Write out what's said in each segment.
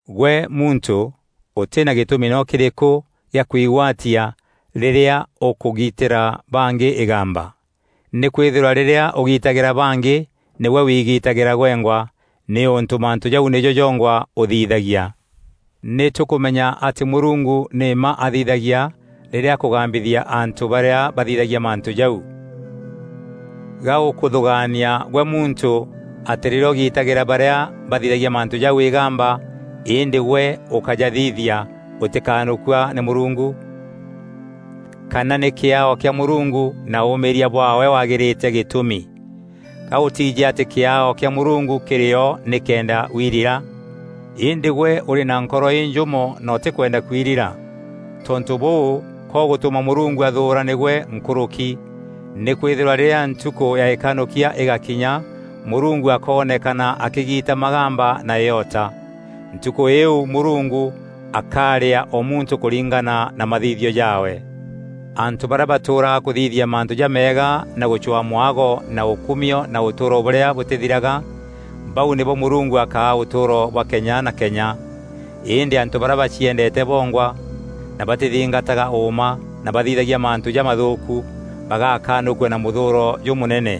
Gwe muntû, ûtî na gîtûmi noo kîrîkû gîa kuigwatia rîrîa ûkûgiitîra bangî îgamba. Nîkwîthîrwa rîrîa ûgiitagîra bangî, nîgwe wiigitagîra gwengwa, nîûntû mantû jau nîjo jongwa ûthithagia. Nî tûkûmenya atî Mûrungu nî mma athithagia rîrîa akûgambithia antû barîa bathithagia mantû jau! Gaûkûthûgaania gwe muntû, atî rîrîa ûgiitagîra barîa bathithagia mantû jau îgamba îndî gwe ûkajathithia, ûtîkanûkua nî Mûrungu? Kana nî kîaao kîa Mûrungu na ûûmîîria bwaawe wagîrîte gîtûmi? Ga ûtiijî atî kîaao kîa Mûrungu kîrî o nîkenda wirira? Îndî gwe ûrî na nkoro înjûmo na ûtîkwenda kwirira. Tontû bûû, ka ûgûtûma Mûrungu athûûra nîgwe nkûrûki; nîkwîthîrwa rîrîa ntukû ya îkanûkia îgakinya, Mûrungu akoonekana akîgiita magamba na îota. Ntukû îîu Mûrungu akarîaa o muntû kûringana na mathithio jaawe. Antû barîa batûûraga kûthithia mantû jameega na gûcwaa mwago na ûkumio na ûtûûro bûrîa bûtîthiraga; bau nîbo Mûrungu akaa ûtûûro bwa kenya na kenya. Îndî antû barîa baciendeete bongwa na batîthingataga ûûma na bathithagia mantû jamathûûku, bagakanûkua na mûthûûro jûmûnene.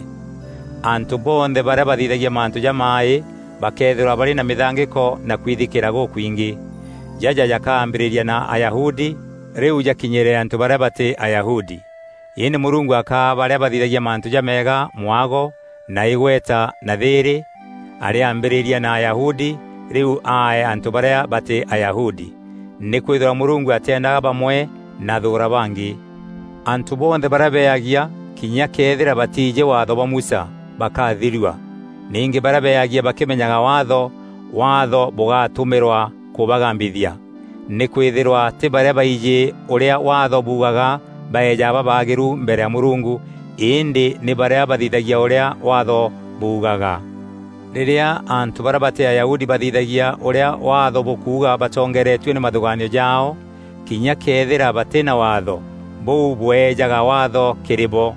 Antû bonthe barîa bathithagia mantû jamaaî bakeethîrwa barî na mîthangîko na kwithikîîra gûkwingî. Jaja jakambîrîria na Ayahudi, rîu jakinyîre antû barîa batî Ayahudi. Îndî Mûrungu akaa barîa bathithagia mantû jameega mwago, na îgweta na thîîrî; arîambîrîria na Ayahudi, rîu aee antû barîa batî Ayahudi. Nîkwîthîrwa Mûrungu atîendaga bamwe na athûûra bangî. Antû bonthe barîa beagia kinya këethîra batiijî Waatho bwa Musa, bakathirua. Ningî barîa beagia bakîmenyaga Waatho, Waatho bûgatumîrwa kûbagambithia. Nîkwîthîrwa tî barîa baijî ûrîa Waatho buugaga baejaga babaagîru mbere ya Mûrungu, îndî nî barîa bathithagia ûrîa Waatho buugaga. Rîrîa antû barîa batî Ayahudi bathithagia ûrîa Waatho bûkuuga batongeeretue nî mathûgaanio jaao, kinya këethîra batî na Waatho, bûu bweejaga Waatho kîrî bo.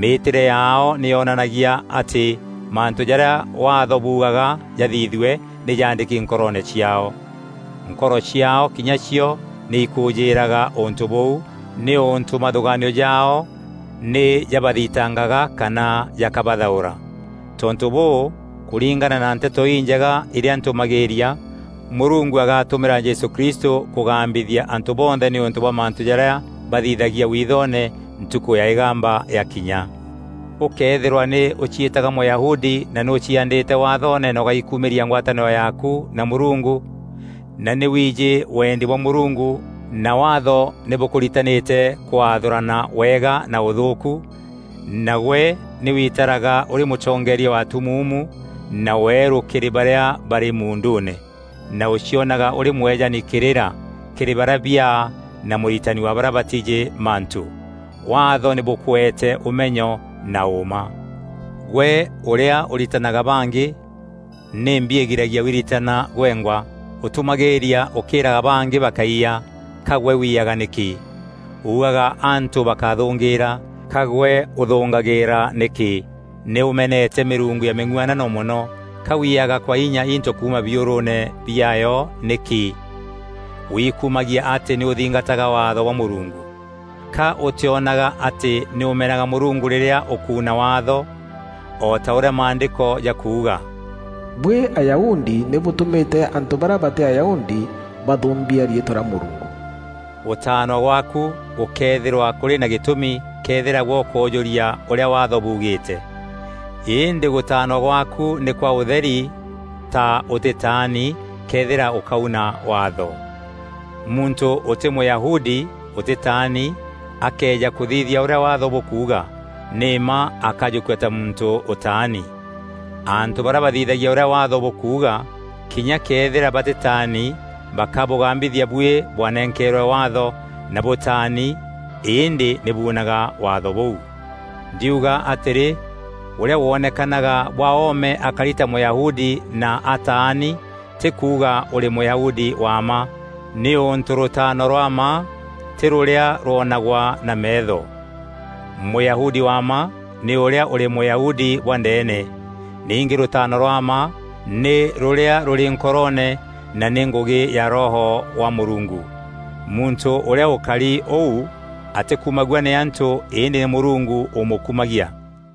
Mîîtîre yaao nî yonanagia atî mantû jarîa Waatho buugaga jathithue nî jaandîki nkoroone ciaao. Nkoro ciaao kinya cio nî ikûûjîîraga ûntû bûu, nîûntû mathûgaanio jaao nî jabathitangaga kana jakabathaûra. Tontû bûû, kûringana na Nteto Injega irîa ntûmagîîria, Mûrungu agatumîra Jesû Kristû kûgambithia antû bonthe nîûntû bwa mantû jarîa bathithagia wiithoone ntukû ya îgamba yakinya. Ûkëethîrwa nî ûciîtaga Mûyahudi na nî ûciaandîte Wathoone na ûgaikumîria ngwatanîro yaaku na Mûrungu; na nî wiijî weendi bwa Mûrungu na Waatho nî bûkûritanîte kwathûrana wega na ûthûûku; na gwe nî witaraga ûrî mûtongeeria wa atumuumu na weerû kîrî barîa barî muunduune; na ûcionaga ûrî mwejani kîrîra kîrî barîa biaa na mûritani wa barîa batiijî mantû. Waatho nî bûkûete ûmenyo na ûûma. Gwe ûrîa ûritanaga bangî, nîmbi îgiragia wiritana gwengwa? Ûtûmagîîria ûkîîraga bangî bakáiya, ka gwe wiyaga nîkî? Uugaga antû bakáthûngîîra, ka gwe ûthûngagîîra nîkî; nî ûmenete mîrungu ya mîng'uanano mono, ka wiiyaga kwa inya into kuuma biûrûûne biaayo nîkî? Wikumagia atî nî ûthingataga Waatho bwa Mûrungu. Ka ûtîonaga atî nî ûmenaga Mûrungu rîrîa ûkuuna Waatho? O ta ûrîa Maandîko jakuuga: “Buî Ayahudi nî bûtûmîte antû barîa batî Ayahudi bathûûmbia riîtwa rîa Mûrungu!” Gûtaanwa gwaaku gûkeethîrwa kûrî na gîtûmi këethîra gwe ûkoojûria ûrîa Waatho buugîîte. Îndî gûtaanwa gwaaku nî kwa ûtheri ta ûtîtaani, këethîra ûkauna Waatho. Muntû ûtî Mûyahudi, ûtîtaani, akëeja kûthithia ûrîa Waatho bûkuuga, nî mma akajûkua ta muntû ûtaani. Antû barîa bathithagia ûrîa Waatho bûkuuga, kinya këethîra batîtaani bakabûgambithia buî bwanenkeerwe Waatho na bûtaani îndî nî buunaga Waatho bûu. Ndiuga atîrî, ûrîa wonekanaga bwa oome akari ta Mûyahudi na ataani tî kuuga ûrî Mûyahudi wa mma, nîûntû rûtaano rwa mma tî rûrîa rwonagwa na meetho. Mûyahudi wa mma nî ûrîa ûrî Mûyahudi bwa ndeene. Ningî rûtaano rwa mma nî rûrîa rûrî nkoroone na nî ngûgî ya Roho wa Mûrungu. Muntû ûrîa ûkari ûu atîkumagua nî antû îndî nî Mûrungu ûmûkumagia.